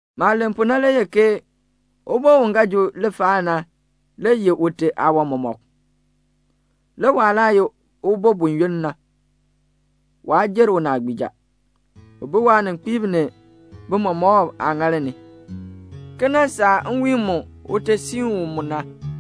Maah len pu na le ye ke ubo u ga ji lifaal na le yeh ute aawan mɔmɔk; le waah laa ye ubo buyoonn na, waa jer unaagbiija. U bi waaninkpiib ni tiichatiib aaŋaal ni, ki nan saa nwiin mu ute siin u mu na.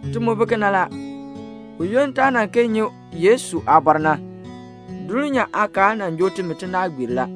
Ti mu bi kena la. Buyoonn taa nan kee nyi Yesu aabɔr na, dulnyaa aakaal nan joo timi tinaagbiir la.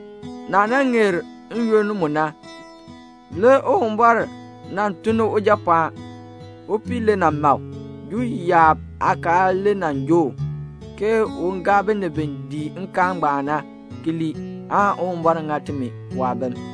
Naah nan ŋeer n-yoonn mu na, le Uwumbɔr nan tun ni Ujapɔɔn. Upii le nan ma u. Juu yaab aakaal le nan joo u, ke un gaa binib bi dii nkaal ngbaan na ki lii, aan Uwumbɔr ŋa timi waabim.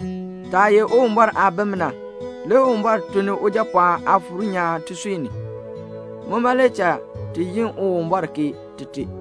Taah ye Uwumbɔr aabim na, le Uwumbɔr tun ni Ujapɔɔn Aafuur nyaan tisui ni. Muma le cha ti yi Uwumbɔr ke Tite.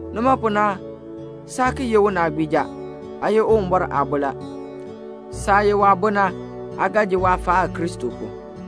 Nima pu na saa ki ye unaagbiija. Aa ye Uwumbɔr aabo la. Saah ye waabo na, aa ga ji waafaal [Kristo pu].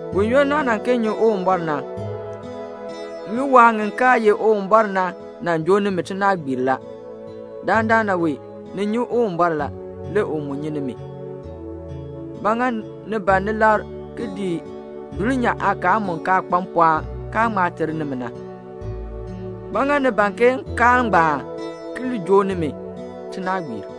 Buyoonn naa nan kee nyi Uwumbɔr na, ŋiwaa ŋi kaa ye Uwumbɔr na nan joo nimi tinaagbiir la. Dandana wee ni nyi Uwumbɔr la. Le u mu nyi nimi. Ba ŋa ni ban ni labr ki ki dii dulnyaa aakaal mu kaa kpa mpɔɔn kaa ŋma ter nimi na? Ba ŋa ni ban ke nkaal ngbaan ki joo nimi tinaagbiir?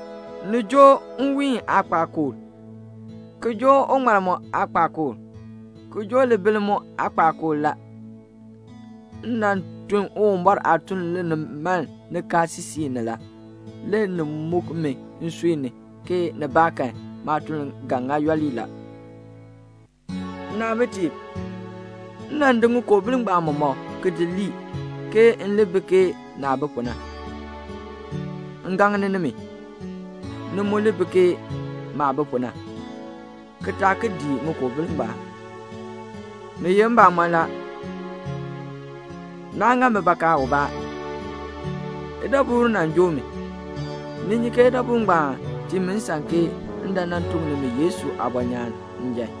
Ni joo nwiin aakpakool, ki joo uŋmal mu aakpakool, ki joo libiln mu aakpakool la. M nan tun Uwumbɔr aatuln linimaln nikaasisik ni la. Le ni muk mi nsui ni, ke nibaakan maatuln ga ŋa yooli la. Nnaabitiib, m nan di ŋikoobil ngbaan mɔmɔk ki di lii, ke m li bi ke naah bi pu na. M gaŋni nimi, ni mu li bi ke maah bi pu na, ki taa ki dii ŋikoobil ngbaan. Ni ye mbamɔn la, naa ŋa mi bakaa ubaa. Idabur nan joo mi. Ni nyi ke idabur ngbaan tii mi nsan ke m dan nan tuk nimi Yesu aabɔnyaan njan.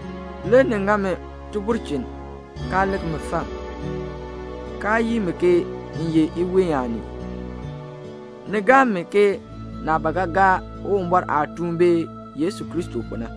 Le ni ŋa mi tibulchin, kaa lik mi fam, kaa yii mi ke m ye iween aanii. Ni gaa mi ke naah ba ga gaa Uwumbɔr aatuun bee Yesu Kristo pu na.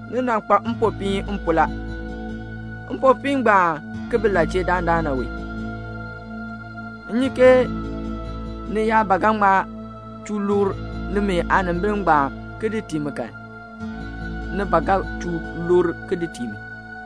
Ni nan kpa mpopiin m pu la. Mpopiin ngbaan ki bi la chee dandana wee? M nyi ke ni yaa ba ga ŋma chuu lukr nimi aanimbil ngbaan ki di tii mi kan, ni ba ga chuu lukr ki di tii mi.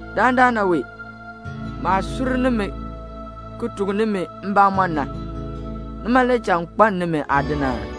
Dandana wee, maah sur nimi ki tuk nimi mbamɔn na, nima le cha m kpaln nimi aadin aa?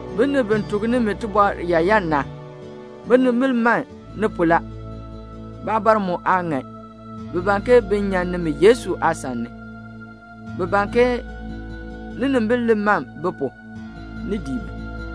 Binib bi tuk nimi tibɔr yaayan na, binimbil man ni pu la. Baabɔr mu aa ŋan. Bi ban ke bin nyan nimi Yesu aasan ni. Bi ban ke ninimbil li man bi pu, ni dii bi.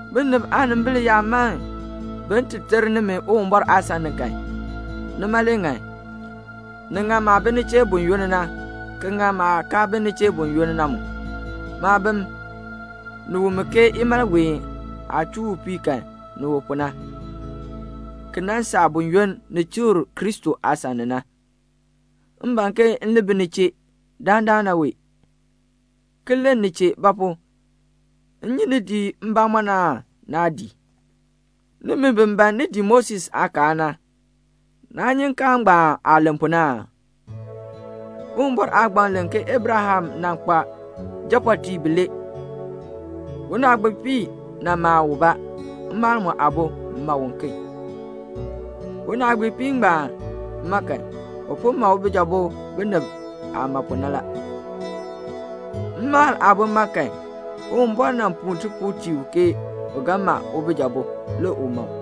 Binib aanimbil yaa man bin ti ter nimi Uwumbɔr aasan ni kan, nima le ŋan. Ni ŋan maah bi ni chee buyoonn na, ki ŋan maah kaa bi ni chee buyoonn na mu. Maabim, ni wu mi ke imalween aah chuu upii kan ni wu pu na, ki nan saa buyoonn ni chikr Kristo aasan ni na. M ban ke m li bi ni chee dandana wee, ki len ni chee; ba pu? m nyi ni dii mbamɔm aan naa dii? Nimi bi ban ni dii Moses aakaal na, naa nyi nkaal ngbaan aah len pu na aa? Uwumbɔr aagbaŋ len ke Abraham nan kpa japɔɔtiib bilee. Unaagbiipii nan ma ubaa, mmaal aabo mu ma uken. Unaagbiipii ngbaan ma kan, u po ma ubijabo binib aageehn pu la. Mmaal aabo ma kan, Uwumbɔr nan puu tipuul tii u ke u ga ma ubijabo, le u ma u.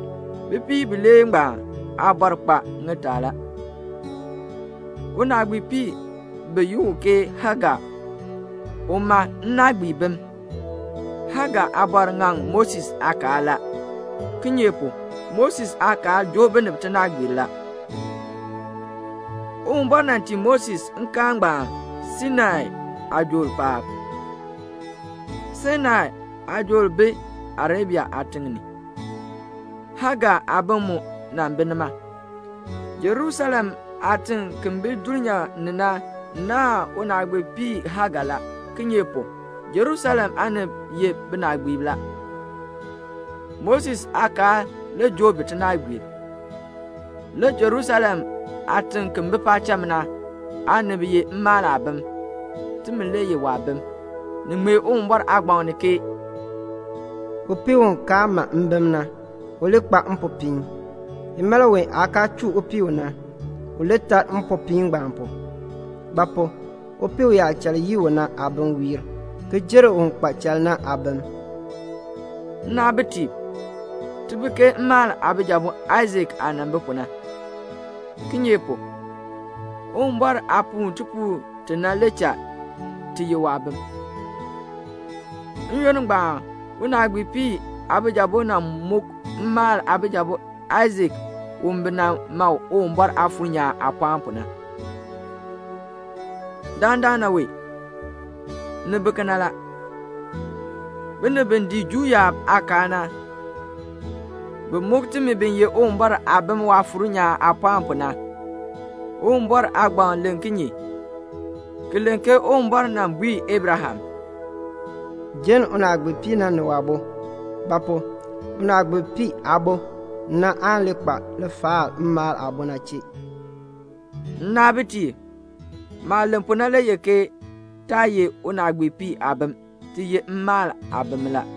Bipiib bilee ngbaan aabɔr kpa ŋitaa la. Unaagbiipii bi yi u ke Hagar, u ma nnaagbiibim. Hagar ŋaŋ Moses aakaal la. Kinye pu? Moses aakaal joo binib tinaagbiir la. Uwumbɔr nan tii Moses nkaal ngbaan Sainai aajool paab. Sainai aajool bi Arabia aatiŋ ni. Hagar aabim mu nan bi nima. Jerusalem aatiŋ ki bi dulnyaa ni na naahn unaagbiipii Hagar la; kinye pu? Jerusalem aanib ye binaagbiib la. Moses aakaal le joo bi tinaagbiir. Le Jerusalem ki bi paacham na aanib ye mmaal aabim. Timi le ye waabim. Ni ŋmee Uwumbɔr aagbaŋ ni ke "Upii u kaa ma mbim na, u li kpa mpopiin! Imalween aah kaa chuu upii u na, u li tar mpopiin ngbaan pu; ba pu? upii uyaachal yii u na aabim wiir, ki jer un kpa chal na aabim." Nnaabitiib, ti bi ke mmaal aabijabo Aisak aah nan bi pu na; kinye pu? Uwumbɔr aah puu tipuul ti na le cha ti ye waabim. N-yoonn ngbaan unaagbiipii aabijabo nan muk mmaal aabijabo Aisak u bi nan ma u Uwumbɔr Aafuur nyaan aapɔɔn pu na. Dandana wee, ni bi kena la. Binib bi dii Juu yaab aakaal na, bi muk timi bi ye Uwumbɔr aabim Waafuur nyaan aapɔɔn pu na. Uwumbɔr aagbaŋ len kinye? Ki len ke Uwumbɔr nan bui Abraham, "Jenn unaagbiipii na ni waabo; ba pu? unaagbiipii aabo na aan li kpa lifaal mmaal aabo na chee." Nnaabitiib, maah len pu na le ye ke taa ye unaagbiipii aabim, ti ye mmaal aabim la.